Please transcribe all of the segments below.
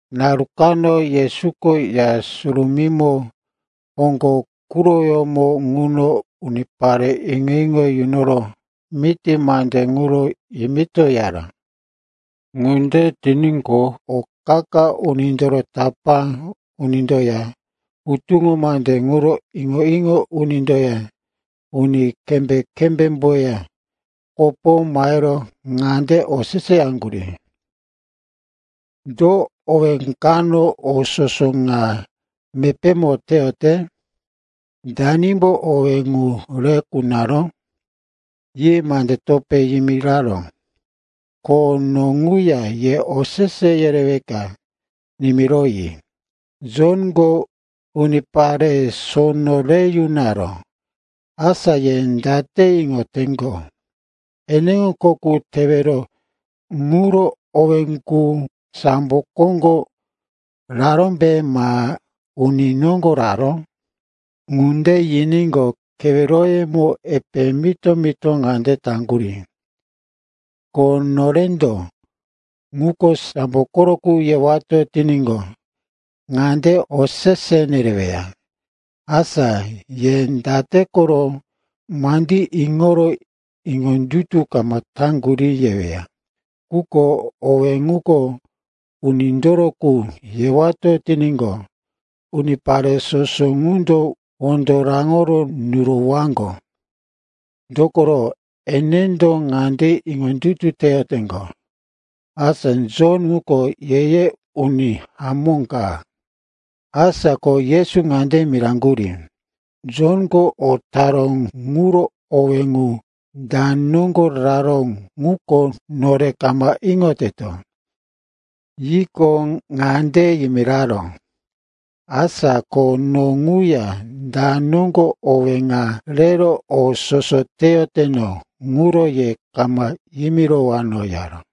Naru kano Yesuko Ya Surumímo hoŋgo quroyómo ŋuno unipare iŋo-iŋo yunoro miti mande ŋuro yimitoyaró. Ŋunde tiníqo, o qa-qa unindoro tapá unindoya hutuŋo mande ŋuro iŋo-iŋo unindoya uni kembé-kembémboya kopo mahero ŋande oseseyaŋgurí, “Do owé kano o soso ŋa mepémo teyote? Danimbo owé ŋu re kunaró?” Yi mande topé yimiraró, “Ko no ŋuya ye osese yereweka nimiroyi. Jonko unipare sono re yunaró. Asa ye date iŋoteŋgo, eneŋo kho qu tewero ŋuro owé ŋu, sambo koŋgo rarómbe ma uni noŋgo raró?” Ŋunde yiníqo, keweroyemo epe mito-mito ŋande taŋgurí, “Ko norendo, ‘Ŋuko sambo koro qu,’ yewato tiníqo, ŋande osese nereweya, ‘Asa ye date koro mandí iŋoro iŋondutu kama taŋgurí,’ yeweya. Quko, owé ŋuko unindoro qu, yewato tiníqo, unipare soso ŋundo wondo raŋoro nurowaŋgo, dokoro enendo ŋande iŋondutu teyoteŋgo, asa Jon ŋuko ye-ye uni hamó ka.” Asa ko Yesu ŋande miraŋgurí, “Jonko o taró ŋuro owé ŋu da noŋgo raró ŋuko nore kama iŋoteto.” Yiqo, ŋande yimiraró, “Asa ko no ŋuya da noŋgo owé ŋa rero o soso teyoteno ŋuro ye kama yimirowano,” yaró.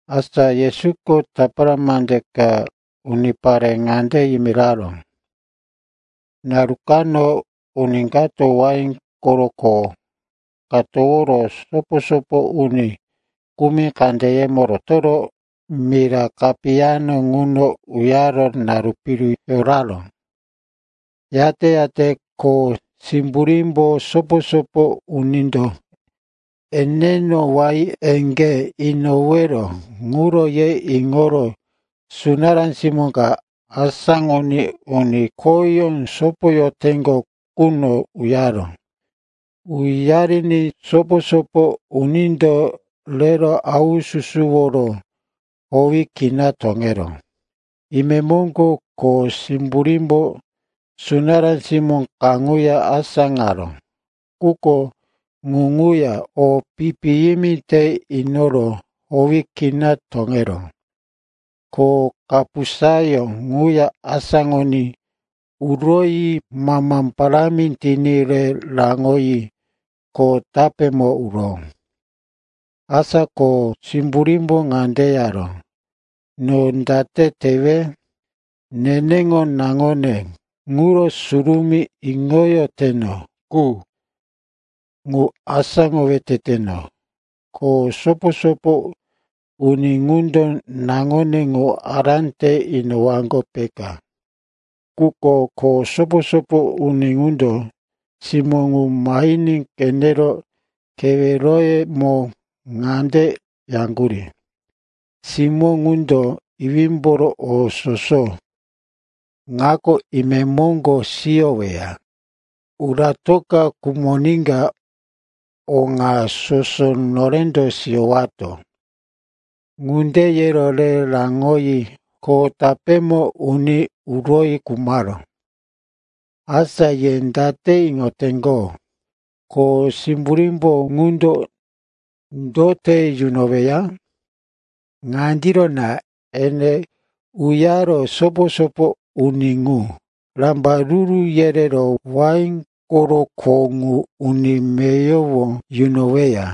Asa Yesuko tapara mande ka unipare ŋande yimiraró, “Naru kano uni kato wain koro kho ka toworo sopo-sopo uni kumi kandeyemo rotoro mira kapiyamo ŋuno uyaro naru piru yoraró. Yate-yate kho simburímbo sopo-sopo unindo eneŋo wain eŋgé inowero ŋuro ye iŋoro sunará simó ka asáŋoní uni khoyó sopoyoteŋgo quno uyaró. Uyariní sopo-sopo unindo rero haususuworo howi kina toŋeró. Imemoŋgo kho simburímbo sunará simó kaŋuya asáŋaró, quko ŋu ŋuya o pi-piyimi te inoro howi kina toŋeró. Ko kapusayó ŋuya asáŋoní uroyi mama parámi tiní re raŋoyi kho tapémo uró. “Asa kho simburímbo ŋande yaró, ‘No date tewe? Neneŋo naŋone, ŋuro surumí iŋoyoteno qu, ŋu asáŋowe teteno. Kho sopo-sopo uni ŋundo naŋone ŋu ará te inowaŋgo, peka.’ “Quko kho sopo-sopo uni ŋundo, simó ŋu mahiní qenero, keweroyemo ŋande yaŋgurí, ‘Simó ŋundo iwímboro o soso ŋako imemoŋgo siyoweya. Uratoka khumoníka o ŋa soso norendo siyowato.’ Ŋunde yero re raŋoyi kho tapémo uní uroyi khumaró. Asa, ye date iŋoteŋgo, kho simburí ŋundo, do te yunoweya? Ŋandiro na, ene uyaro sopo-sopo uni ŋu rambaruru yerero wain koro kho ŋu uni meyowo yunoweya.”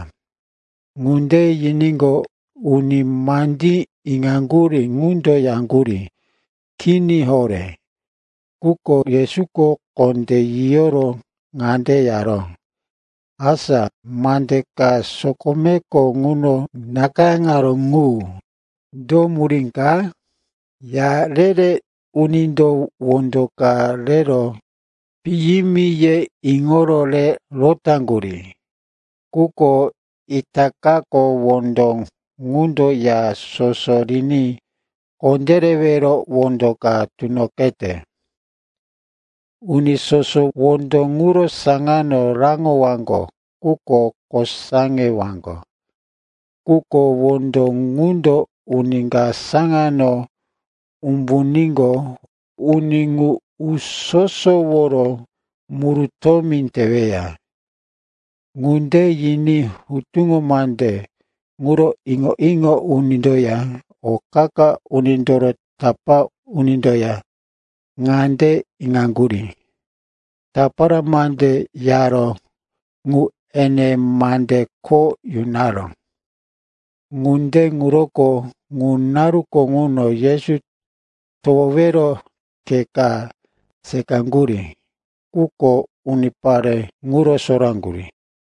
Ŋunde yiníqo, uni mandí iŋaŋgurí ŋundo yaŋgurí, “Kini horé!” Quko Yesuko kondé yiyoro ŋande yaró, “Asa, mande ka sokomeko ŋuno nakayáŋaró ŋu, do murí ka? “‘Ya re-re unindo wondo ka rero, piyimi, yero iŋoro re rotaŋgurí, quko itakako wondo ŋundo ya soso riní kondérewero wondo ka tunoqete.’ Uni soso wondo ŋuro saŋano raŋowaŋgo quko kosaŋewaŋgo. Quko wondo ŋundo uni ka saŋano umbuníqo, uni ŋu uso-soworo murutómi teweya.” Ŋunde yiní hutuŋo mande ŋuro iŋo-iŋo unindoya o qa-qa unindoro tapá unindoya ŋande iŋaŋgurí, tapara mande yaró ŋu ene mande kho yunaró. Ŋunde ŋuroko ŋu naruko ŋuno Yesu towowero khe ka seqaŋgurí, quko unipare ŋuro soraŋgurí.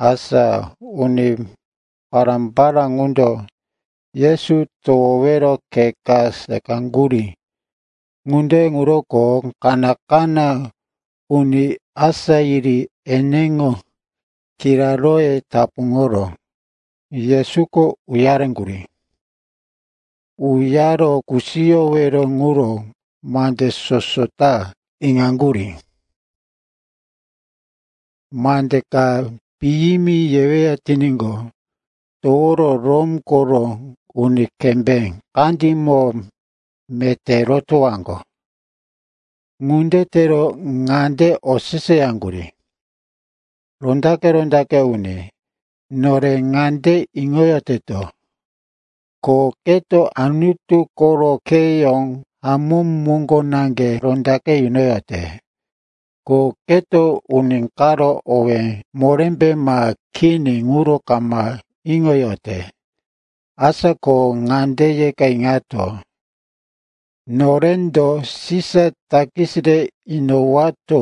Asa uni pará-pará ŋundo Yesu towowero khe ka seqaŋgurí. Ŋunde ŋuroko kaná-kaná uni asá yiri eneŋo kiraróye tapuŋoro Yesuko uyareŋgurí. Uyaro kusiyowero ŋuro mandí soso ta iŋoyaŋgurí. Mande ka piyimi yeweya tiníqo, toworo Rom koro uni kembé kandímo meté rotowaŋgo. Ŋunde tero ŋande oseseyaŋgurí, “Rondaqe-rondaqe uni, nore ŋande iŋoyoteto, ko keto Anutu koro kheyó hamó moŋgo naŋge rondaqe yunoyote. Ko keto uni karo owé morémbe ma kini ŋuro kama iŋoyote. Asa ko ŋande yeka iŋato, norendo Sisa takis re inowato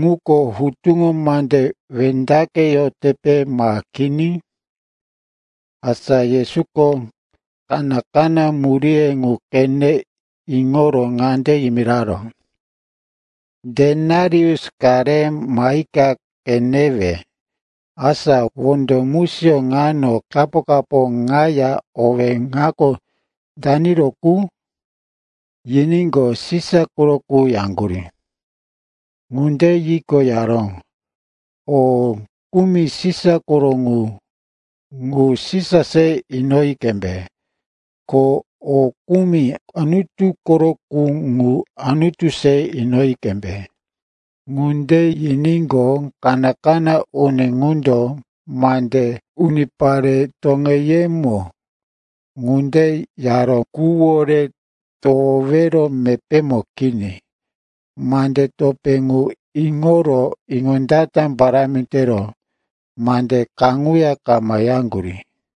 ŋuko hutuŋo mande wendaqeyotepe ma kini?” Asa Yesuko kaná-kaná muríye ŋu qene iŋoro ŋande yimiraró, “Denarius ka re mahika qenewe. Asa wondo musiyó ŋano kapo-kapo ŋaya owí ŋako daniro qu?” Yiníqo, “Sisa koro qu,” yaŋgurí. Ŋunde yiqo, yaró, “O kumi Sisa koro qu, ŋu Sisa se inoyi qembe. Ko o kumi Anutu koro qu, ŋu Anutu se inoyi qembe.” Ŋunde yiníqo, kaná-kaná uni ŋundo mande unipare toŋeyemo ŋunde yaró quwore towowero mepémo kini. Mande topé ŋu iŋoro iŋondata parámi tero mande kaŋuya kama yaŋgurí.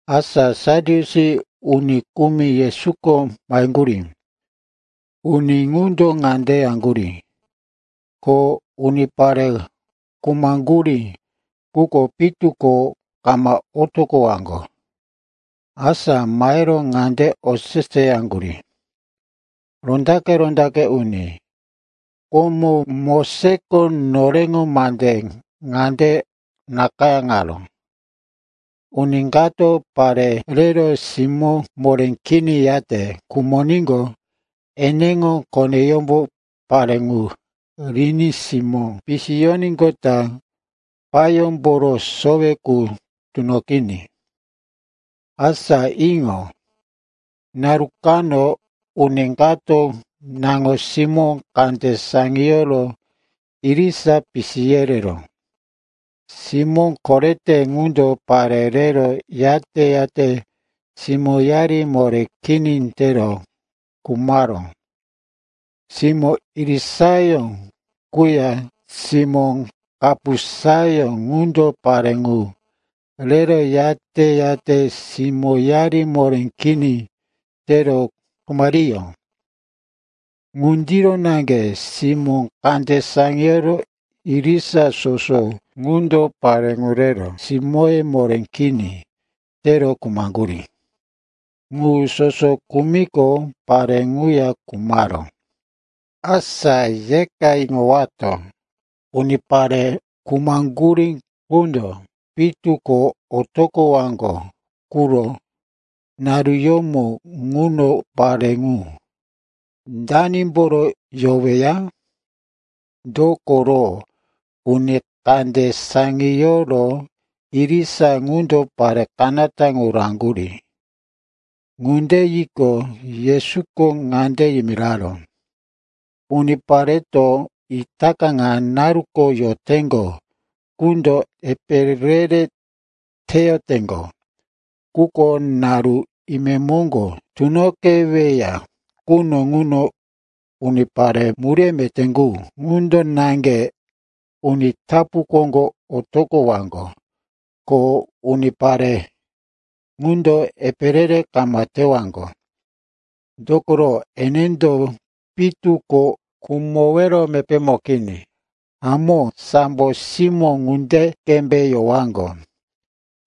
Asa Sadyusi uni kumi Yesuko maheŋgurí. Uni ŋundo ŋande yeyaŋgurí, ko unipare khumaŋgurí qundo pitu ko kama otoqowaŋgo. Asa mahero ŋande oseseyaŋgurí, “Rondaqe-rondaqe uni, komo Mosesko noreŋo mande ŋande nakayáŋaró, ‘Uni kato pare rero simó moré kini yate khumoníqo, eneŋo koneyómbo pare ŋu riní simó pisiyoníqota payómboro sowe qu tunoqiní.’ Asa iŋo. Naru kano uni kato naŋo-simó kande saŋiyoro irisa pisi yereró. Simó korete ŋundo pare rero, yate-yate simóyari moré kini tero khumaró. Simó irisayó quya simó kapusayó qundo pare ŋu rero yate-yate simóyari moré kini tero khumariyó. Ŋundiro naŋge simó kande saŋiyoro irisa soso ŋundo pare ŋu rero simóye moré kini tero khumaŋgurí. Ŋu soso khumiqo, pare ŋuya khumaró. Asa yeka iŋowato, unipare khumaŋgurí qundo pitu ko otoqowaŋgo quro naruyómo ŋuno, pare ŋu, danimboro yoweya? Dokoro uni kande saŋiyoro irisa qundo pare kanata ŋu raŋgurí.” Ŋunde yiqo, Yesuko ŋande yimiraró, “Unipareto itaka ŋa naruko yoteŋgo qundo epe re-re teyoteŋgo. Quko naru imemoŋgo tunoqeweya quno ŋuno unipare muríye meté qu, ŋundo naŋge uni tapu koŋgo otoqowaŋgo. Ko unipare ŋundo epe re-re kama tewaŋgo. Dokoro enendo pitu ko khumowero mepémo kini. Hamó, sambo simó ŋunde qembe yowaŋgo.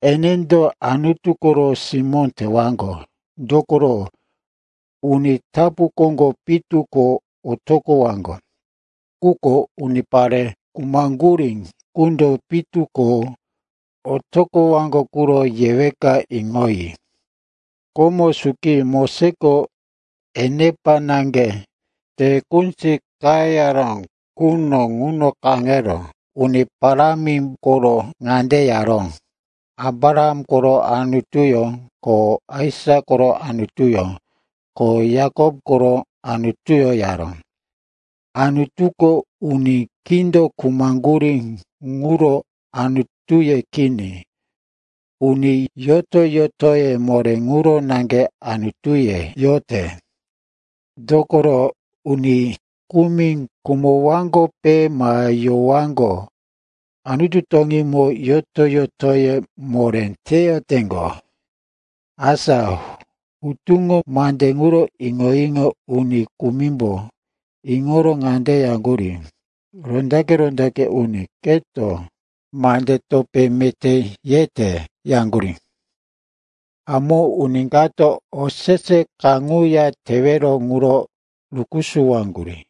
Enendo Anutu koro simó tewaŋgo, dokoro uni tapu koŋgo pitu ko otoqowaŋgo. Quko unipare khumaŋgurí qundo pitu ko otoqowaŋgo quro yeweka iŋoyi. Komo suki Moses enepa naŋge te kunzi qayara quno ŋuno kaŋero Uni Parámi koro ŋande yaró, ‘Abraham koro Anutuyó, ko Aisak koro Anutuyó, ko Yakop koro Anutuyó,’ yaró. Anutuko uni kindo khumaŋgurí ŋuro Anutuye kini. Uni yoto-yotoye moré ŋuro naŋge Anutuye yote. Dokoro uni kumi khumowaŋgope ma yowaŋgo, Anutu toŋímo yoto-yotoye moré teyoteŋgo.” Asa hutuŋo mande ŋuro iŋo-iŋo uni kumimbo iŋoro ŋande yaŋgurí, “Rondaqe-rondaqe uni, keto mande topé meté yete,” yaŋgurí. Hamó uni kato osese kaŋuya tewero ŋuro rukusuwaŋgurí.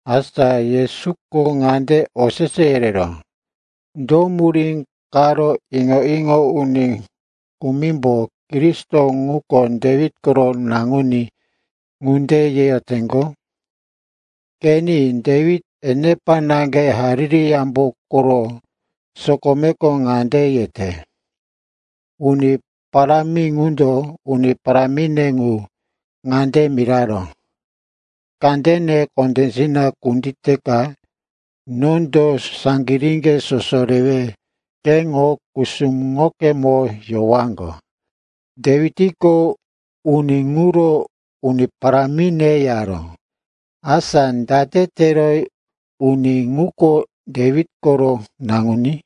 Asa Yesuko ŋande osese yereró, “Do murí karo iŋo-iŋo uni kumimbo, Kristo ŋuko Dewit koro naŋuní, ŋunde yeyoteŋgo? Qeni, Dewit enepa naŋge Hariri Yambo koro sokomeko ŋande yete, “‘Uni Parámi ŋundo uni parámine ŋu ŋande miraró, “Kandene kondésina kunditeka nondo saŋgiríŋge soso rewe keŋo kusuŋokemo yowaŋgo.”’ Dewitko uni ŋuro, ‘Uni parámine,’ yaró. Asa date tero uni ŋuko Dewit koro naŋuní?”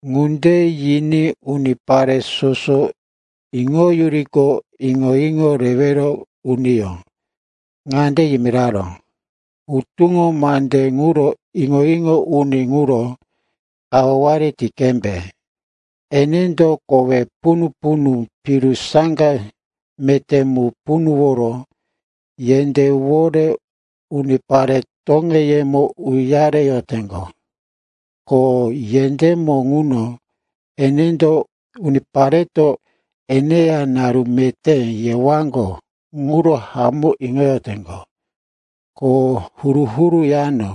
Ŋunde yiní unipare soso iŋoyuriqo, iŋo-iŋo rewero uniyó ŋande yimiraró, “Hutuŋo mande ŋuro iŋo-iŋo uni ŋuro kawaware ti qembe. Enendo kowe punu-punu piru saŋga meté mu punuworo yendéwore unipare toŋeyemo uyareyoteŋgo, ko yendémo ŋuno enendo unipareto eneya naru meté yewaŋgo ŋuro hamó iŋoyoteŋgo, ko huru-huru yano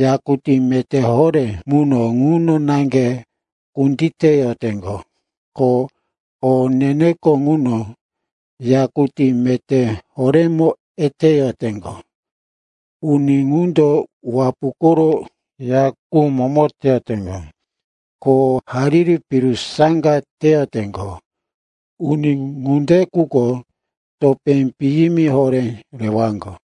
yakutí meté horé muno ŋuno naŋge kunditeyoteŋgo, ko o ne-neko ŋuno yakutí meté horémo eteyoteŋgo. Uni ŋundo wapu koro ya qu momo teyoteŋgo, ko hariri piru saŋga teyoteŋgo. Uni ŋunde qundo topé piyimi horé rewaŋgo.”